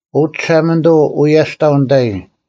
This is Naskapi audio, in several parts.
ᐅ ᒋᓴᒪᓂᑐᐤ, ᐅᔭᔅᑕᐤ ᓂᑕᐃ;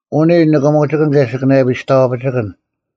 ᐅᓂ, ᓂᑭᒧᒋᑭᓐ ᑭᔭ ᓯᑭᓇᔭᐱᔾ ᒋᔍᐛᐱᒋᑭᓐ: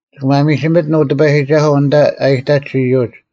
ᒋᑭ ᒪᒥᒋᒥᑎᓐ, ᐅ ᑎᐸᔨᒋᒐᓱᐤ, ᐊᓐᑕ ᐊ ᐃᑕᒡ ᐃᔪᒡ;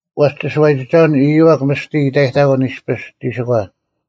ᐛᔅ ᒋᓱᐛᔨᒋᒐᐅᓐ ᐊᔪᐛᒃ ᒥᔅᑎ ᐃᑕᔨᑕᑯᓐ ᐃᔅᐱᔅ ᒋᓯᒂ;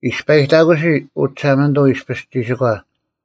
ᐃᔅᐸᔨᑕᑯᓯ, ᐅ ᒋᓴᒪᓂᑐᐤ, ᐃᔅᐱᔅ ᒋᓯᒂ;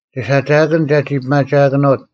ᒋᓴᒋᐊᑭᓐ ᒐᒋ ᐱᒪᒋᐊᑭᓄᐅᑦ;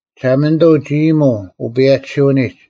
ᒋᓴᒪᓂᑐᐤ ᒋ ᐃᔨᒧᐤ ᐅᐸᔭᒋᓯᐅᓂᒡ;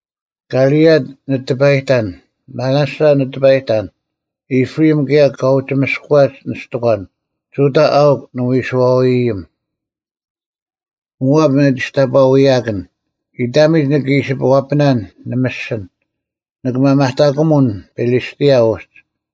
ᑭᓕᐊᑦ ᓂ ᑎᐸᔨᑕᓐ, ᒥᓇᓴ ᓂ ᑎᐸᔨᑕᓐ; ᐃᑉᕋᐃᒻ ᑭᔭ ᑲ ᐅᒋ ᒥᔅᑯᐛᒡ ᓂᔅᑎᒂᓐ; ᒍᑕ ᐊᐅᒄ ᓂᐎᓱᐛᐅᐃᔨᒻ; ᒧᐊᑉ ᓂᒋᔅᑕᐸᐅᐎᔭᑭᓐ; ᐃᑕᒥᒡ ᓂᑭ ᐃᓯ ᐛᐱᓇᓐ ᓂᒥᔅᒋᓐ; ᓂᑭ ᒪᒪᑕᑯᒧᓐ ᐱᓕᔅᑎᐊ ᐅᒡ᙮”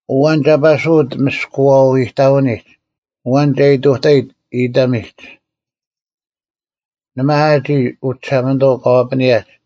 ᐊᐛᓐ ᒐ ᐸᓱᐅᑦ ᒥᔅᑯᐎᐤ ᐃᑕᐅᓂᒡ? ᐊᐛᓐ ᒐ ᐃᑐᑕᐃᑦ ᐃᑕᒥᒡ? ᓇᒪ ᐊ ᒋᔾ, ᐅ ᒋᓴᒪᓂᑐᐤ, ᑲ ᐛᐱᓂᔭᒡ?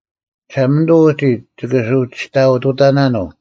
ᒋᓴᒪᓂᑐᐤ ᐅᒋ ᒋᑭ ᓱᒋᑕᐊᐅ-ᑐᑕᓇᓄᐤ: